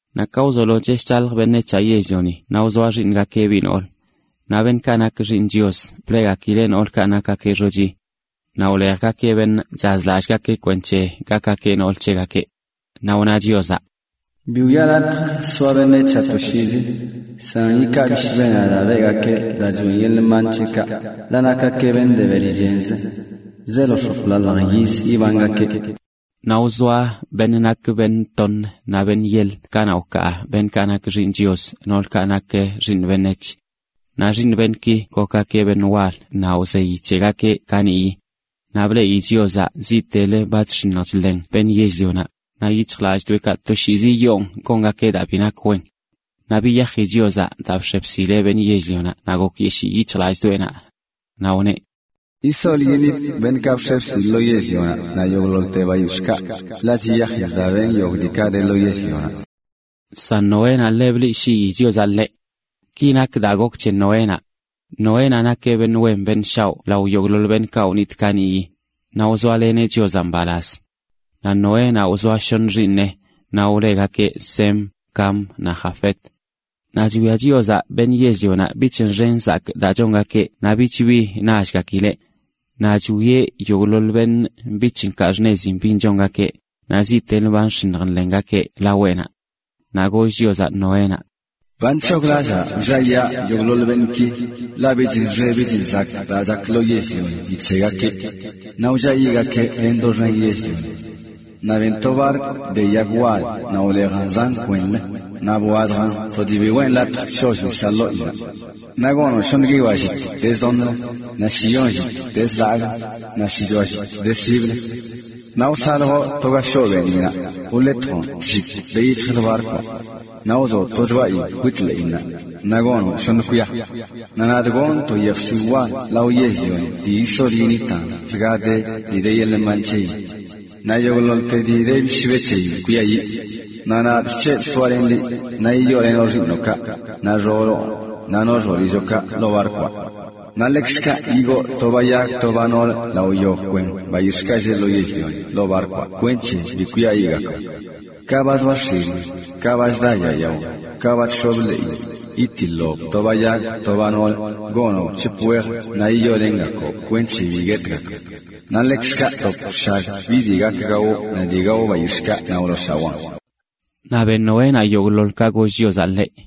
Naꞌ ka wzolo chesh chalj beṉec̱haꞌ yell-lioni naꞌ wzoa xiiṉgakeꞌ biꞌ noolə. Naꞌ beṉꞌkaꞌ nak xiiṉ Chios,a bleꞌgakileꞌ noolkaꞌ nakgakeꞌ xochi. Naꞌ wlejgakeꞌ beṉꞌ chazlallꞌgakeꞌ kwenc̱he gakgakeꞌ nool c̱hegakeꞌ. Naꞌ wna Chiozaꞌ: “Bi wiꞌa latj soa beṉec̱haꞌ toshiizi, san yikaa bishbenaꞌ daa beꞌgakee daa choꞌen yeḻꞌ mban c̱heꞌkaꞌ, ḻaꞌ nakgakeꞌ beṉꞌ de beli chenzə. Zeelo x̱oplalj yizzə ibangakeꞌ.” Naꞌ wzoa beṉꞌ nakeꞌ beṉꞌ toṉə naꞌ beṉꞌ yeḻə kanaꞌ wkaa beṉꞌkaꞌ nak “xiiṉ Chios” noolkaꞌ nak xiiṉ beṉec̱h. Naꞌ xiiṉ beṉꞌki gokgakeꞌ beṉꞌ wal naꞌ wzeyi c̱hegakeꞌ kaniꞌyi. Naꞌ bleꞌi Chiozaꞌ ziꞌtelə ba chx̱iṉj chḻen beṉꞌ yell-lionaꞌ, naꞌ yic̱hjlalldoeꞌkaꞌ toshiizi yoon gongakeꞌ daa bi nak wen. Naꞌ biyaji Chiozaꞌ daa bx̱e bsileꞌ beṉꞌ yell-lionaꞌ naꞌ gokyeshii yic̱hjlallꞌdoꞌenaꞌ. Naꞌ wneꞌ: “Yisol yiṉitꞌ beṉꞌkaꞌ bx̱e bsilꞌ lo yell-lionaꞌ, naꞌ yogꞌḻoḻte bayix̱ꞌkaꞌ, ḻaꞌ chiyajidꞌ daa benꞌ yogꞌ diikaꞌ de lo yell-lionaꞌ.” San Noénaꞌ, ḻe bleꞌshii Chiozaꞌ ḻeꞌ. Ki nak daa gok c̱he Noénaꞌ. Noénaꞌ nakeꞌ beṉꞌ wen beṉꞌ shaoꞌ lao yogꞌḻoḻ beṉꞌkaꞌ wnitꞌ kaniꞌyi, naꞌ wzoaleneꞌ Chiozaꞌ mbalaz. Naꞌ Noénaꞌ wzoa shoṉə xiiṉeꞌ, naꞌ wlegakeꞌ Sem, Cam naꞌ Jafet. Naꞌ chwia Chiozaꞌ beṉꞌ yell-lionaꞌ bich nxe nzakꞌ daa chongakeꞌ naꞌ bich bi nallgakileꞌ. Naꞌ chwieꞌ yogꞌḻoḻ beṉꞌ bich nkaa xṉezin bin chongakeꞌ, naꞌ ziꞌtelə ba nx̱iṉj nḻengakeꞌ laweꞌnaꞌ. Naꞌ goll Chiozaꞌ Noénaꞌ: “Ba nc̱hoglallaa wlliayaa yogꞌḻoḻ beṉꞌki, ḻaꞌ bich nxe bich nzakꞌ daa chak lo yell-lioni ni c̱hegakeꞌ. Naꞌ wlliayiꞌgakee len doxen yell-lioni. Naꞌ ben to barkw de yag wal naꞌ wlejan zan kwenlə, naꞌ bwazjan to dii bi weꞌn latj sholl nisaꞌ ḻoꞌinnaꞌ. Naꞌ gonoꞌn shoṉə guiyoa llit de zdoṉlə, naꞌ shiyon llit de zlagꞌlə, naꞌ shichoa llit de siblə. Naꞌ wsaljoꞌ to ga shoꞌ beeniꞌnaꞌ, wletjoꞌn tllit ka de yic̱hjlə barkwaꞌ. Naꞌ wzoꞌ to choꞌayin kwit ḻeꞌinnaꞌ, naꞌ gonoꞌn shoṉ kwia. Naꞌ nadꞌ gonꞌ to yejsiwꞌ wal lao yell-lioni dii yisol yiṉitan() zgade dii de yeḻꞌ mban c̱heyin. Naꞌ yogꞌḻoḻte dii de bishbe c̱heyin kwiayiꞌ. Naꞌ nadꞌ chc̱hebꞌ soalenꞌ liꞌ, naꞌ yiyoolenoꞌ xiiṉoꞌkaꞌ, naꞌ xooloꞌnaꞌ naꞌ xoolilloꞌkaꞌ ḻoo barkwaꞌ. Naꞌ ḻekzkaꞌ yigoo to ba yag to ba noolə lao yogꞌ kwen bayix̱ꞌkaꞌ lleꞌ lo yell-lioni ḻoo barkwaꞌ, kwenc̱he bi kwiayiꞌgakb. Ka ba zoa x̱ilin, ka ba chda yaa yao, ka ba chx̱ob ḻeeyin, yitiḻoꞌb to ba yag to ba noolə, naꞌ yiyoolengakoob kweṉche bi guetgakb. Naꞌ ḻekzkaꞌ btop bshag bi dii gak gawoꞌ naꞌ dii gao bayix̱ꞌkaꞌ naꞌ wlooshawaan.” Naꞌ ben Noénaꞌ yogꞌḻoḻ ka goll Chiozaꞌ ḻeꞌ.